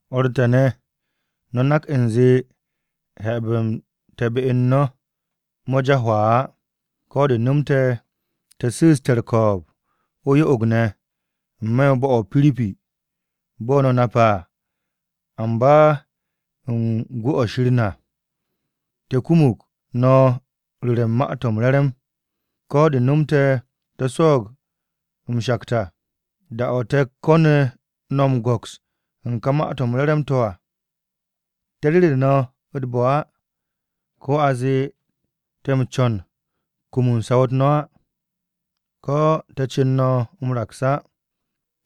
O̱r te̱ ne̱, no̱ nak u̱nze habe̱-m te̱ be u̱n no̱, mo̱ ja hwaa á. Ko̱ de̱ no̱mte̱ te̱ su̱u̱ste̱ u̱r-ko̱o̱b o-yo'og ne̱ n-me̱ u̱n bo̱-o̱ o-Piripi, bo̱ no̱ nape̱ à. Amba u̱n gwu̱-o̱ u̱n Shir na, te̱ kumug no̱ ru̱re̱ u̱n Ma-to̱ m-Re̱re̱m, ko̱ de̱ nomte̱ to̱ swo̱o̱g m-shakt à. Da-o̱ te̱ ko̱nu̱ no̱ m-go̱ks u̱n ka Ma-to̱ m-Re̱re̱m to̱ à, te̱ ru̱re̱ no̱ u̱t-bo̱ á, ko̱ a zee te̱ u̱n co̱n m-kum saw-u̱t no̱ á, ko̱ te̱ co̱n no̱ m-raks á.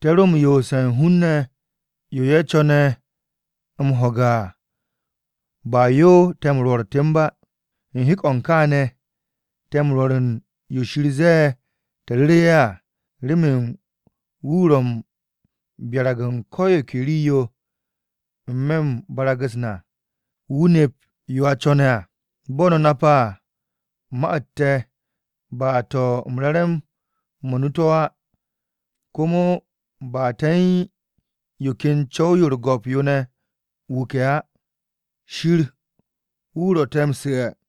Te̱ ro m-yoose̱ u̱n hun-ne̱, yo ye̱ co̱ne̱ m-ho̱ge̱ à ba yo te̱ m-rwo̱r temb á. U̱n hek-o̱ u̱n kááne̱, te̱ m-rwo̱r u̱n yo Shir ze̱e̱ te̱ ru̱ru̱ ye̱ à, remen wu̱ ro̱ u̱n m-byarag u̱n ko̱ yo ke rii-yo n-me̱ u̱n barag-u̱s na wu̱ nep yo a co̱ne̱ à. Bo̱ no̱ nape̱ à, ma-u̱t te̱ ba to̱ u̱n re̱re̱m-mo̱ nu to̱ á, komo ba te̱ u̱n yo ken co̱w-yo u̱r-go̱p yo ne̱ wuke̱ á. Shir wu̱ ro̱ te̱ m-su̱'e̱.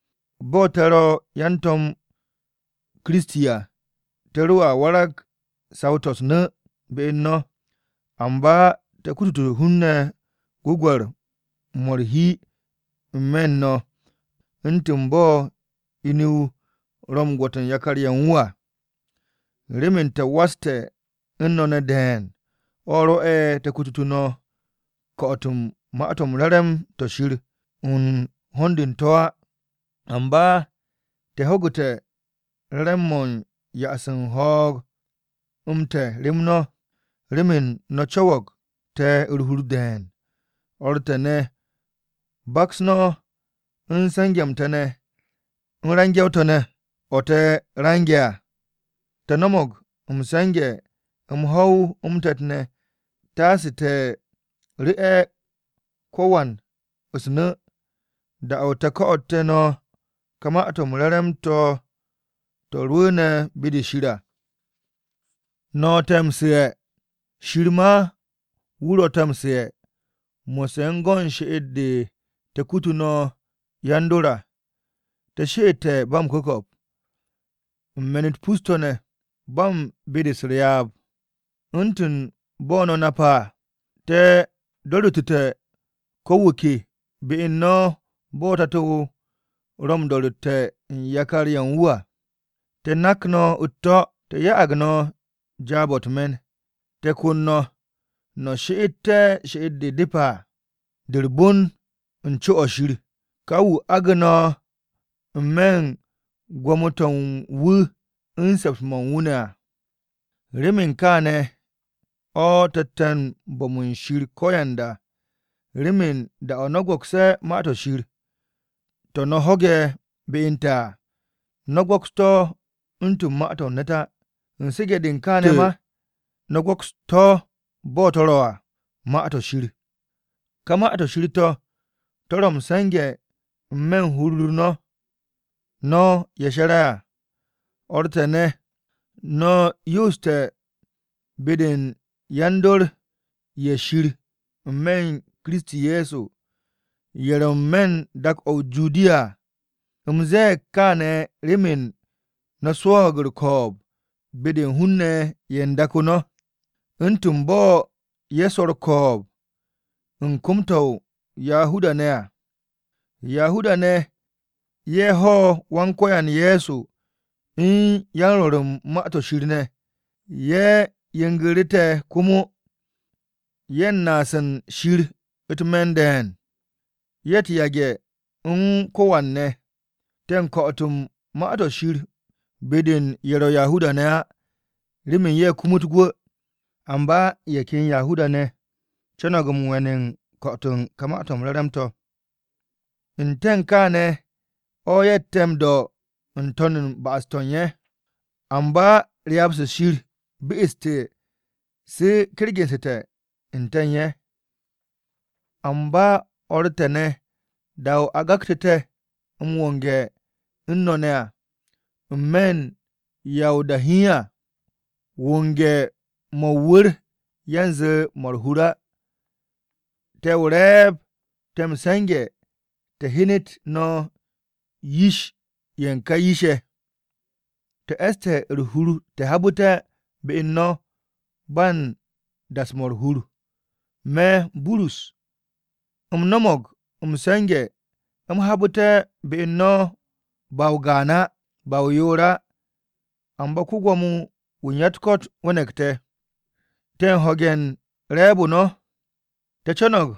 Bo̱ te̱ ro̱ yan-To̱m Kiristi à, te̱ roa warag saw-to̱ u̱s-nu̱ be u̱n no̱. Amba te̱ kutute̱ hun-ne̱ gwu̱gwe̱r-mo̱ u̱r-hi n-me̱ u̱n no̱, u̱ntu̱n bo̱ inu-o ro̱ u̱n gwo̱t u̱n yakar-ye̱ u̱n wu̱ à. Remen te̱ waste̱ u̱n no̱ ne̱ de̱e̱n, o̱ rwo̱'e̱ te̱ ko̱tu̱tu̱ no̱ ko̱'o̱t-o̱ u̱n Ma-to̱ m-Re̱re̱m to̱ Shir u̱n ho̱n-de u̱n to̱ á, amba te̱ ho̱gu̱te̱ m-re̱re̱m mo̱ u̱n ya'as u̱n ho̱o̱g-m te̱ rem no̱, remen no̱ co̱wo̱g te̱ u̱r-hur de̱e̱n. O̱r te̱ ne̱, baks no̱ u̱n se̱nge̱-m te̱ ne̱ u̱n range̱-o te̱ ne̱ o̱ te̱ range̱ à. Te̱ no̱mo̱g m-se̱nge̱ m-ho̱w m-te̱t ne̱ taase te̱ ru̱'e̱ ko-wan u̱s-nu̱, da-o̱ te̱ ko̱'o̱te̱ no̱ ka Ma-to̱ m-Re̱re̱m to̱, to̱ rwu̱u̱ne̱ be-de Shir à. No̱ te̱ m-su̱'e̱, Shir ma wu̱ ro̱ te̱ m-su̱'e̱ mo̱sse̱ u̱n go̱n she'et-de te̱ kutu no̱ yan-dor à. Te̱ she'ette̱ ba m-ku̱ko̱p, u̱n me̱n-u̱t pus-to̱ ne̱, ba u̱n be-de m-pyap. U̱ntu̱n bo̱ no̱ nape̱ à, te̱ do̱ru̱ttu̱te̱ ko̱ wu̱ ke be u̱n no̱ bo̱ tato-o ro̱ m-do̱ru̱tte̱ u̱n yakar-ye̱ u̱n wu̱ à. Te̱ nak no̱ u̱t-to̱, te̱ ya'ag no̱ jaab-o̱ u̱t-me̱n, te̱ kon no̱, no̱ she'et she'et-de depe̱ à, de u̱r-bon u̱n co-o̱ Shir, ka wu̱ agu̱ no̱ n-me̱ u̱n gwo̱mo-to̱ u̱n wu̱ u̱n se̱ps-mo̱ u̱n wu̱ ne̱ à. Remen kaane̱ o̱ te̱tte̱ u̱n bo̱m u̱n Shir ko̱yanda, remen, da-o̱ no̱ go̱kse̱ Ma-to̱ Shir, to̱ no̱ ho̱ge̱ be u̱n te̱ à, no̱ go̱ks to̱ u̱ntu̱n ma-to̱ u̱n ne̱t á. U̱n su̱ge̱-de u̱n kaane̱ ma, no̱ go̱kstu̱ to̱ bo̱ to̱ ro̱ à, Ma-to̱ Shir. Ká Ma-to̱ Shir to̱, to̱ ro̱ m-se̱nge̱ n-me̱ u̱n hur-u̱r no̱, no̱ ye̱ she̱re̱ à. O̱r te̱ ne̱, no̱ yooste̱ be-de yan-dor ye̱ Shir n-me̱ u̱n Kiristi Ye̱so, ye̱ ro̱ n-me̱ u̱n dak-o̱ o-Judiya à. U̱m ze̱e̱g kaane̱ remen no̱ swo̱o̱g u̱r-ko̱o̱b be-de u̱n hun-ne̱ ye̱ u̱n dak-o no̱, u̱ntu̱n bo̱ ye̱ swo̱ u̱n kom-to̱ u̱n Yahuda-ne̱ à. Yahuda-ne̱ ye̱ ho̱ Wan-Ko̱yan Ye̱so u̱n yan-Rwo̱r u̱n Ma-to̱ Shir ne̱, ye̱ yengu̱ru̱ te̱ komo. Ye̱ u̱n naas u̱n Shir u̱t-me̱n de̱e̱n. Ye̱ u̱t-yage̱ u̱n ko̱wan ne̱! Te̱ u̱n ko̱'o̱t Ma-to̱ Shir be-de u̱n ye̱ ro̱ Yahuda-ne̱ á remen ye̱ kumut gwu̱. Amba ye̱ ken Yahuda-ne̱ conog m-we̱n u̱n ko̱'o̱t u̱n ka Ma-to̱ m-Re̱re̱m to̱. N-te̱ u̱n kaane̱ o̱ ye̱tte̱ m-do̱ u̱r-ba'as n-to̱n ba'as-to̱ u̱n ye̱. Amba ryaab-se Shir be'esu̱te̱ se kergu̱nsu̱te̱ n-te̱ u̱n ye̱. Amba, o̱r te̱ ne̱, da-o̱ a gaktu̱ te̱ m-wonge̱ u̱n no̱ ne̱ à n-me̱ u̱n ya o-da hiin à, wonge̱-mo̱ o-wu̱r yanze 'mo̱ u̱r-hur á. Te̱ o-re̱e̱b, te̱ m-se̱nge̱ te̱ hyenet no̱ yish-ye̱ ka yish-ye̱. Te̱ e̱ste̱ u̱r-hur te̱ habu̱te̱ be u̱n no̱ ba u̱n das-mo̱ u̱r-hur. Me̱, Burus, u̱m no̱mo̱g m-se̱nge̱ u̱m habu̱te̱ be u̱n no̱ ba o-gaan á, ba o-yoor á, amba ko-Gwo̱mo-wu̱ u̱n ya-u̱t-ko̱t we̱ne̱g te̱. Te̱ u̱n ho̱ge̱ u̱n re̱e̱b-o no̱. Te̱ co̱no̱g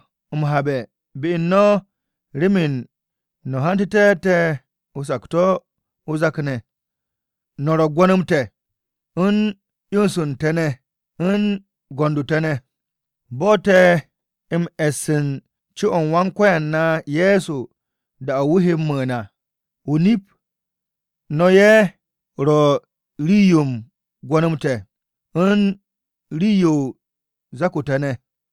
m-habe̱ be u̱n no̱ remen no̱ hantu̱te̱ te̱ o-sakto̱ o-zak ne̱. No̱ ro̱ gwo̱n-m te̱ u̱n 'yons u̱n te̱ ne̱ u̱n go̱nd-o te̱ ne̱, bo̱ te̱ he m-e̱s u̱n co-o̱ u̱n Wan-Ko̱yan na Ye̱so da-o̱ wu̱ he m-mu̱u̱n à. O-nip, no̱ ye̱ ro̱ rii-yo u̱n gwo̱n-m te̱, u̱n rii-yo u̱n zak-o te̱ ne̱.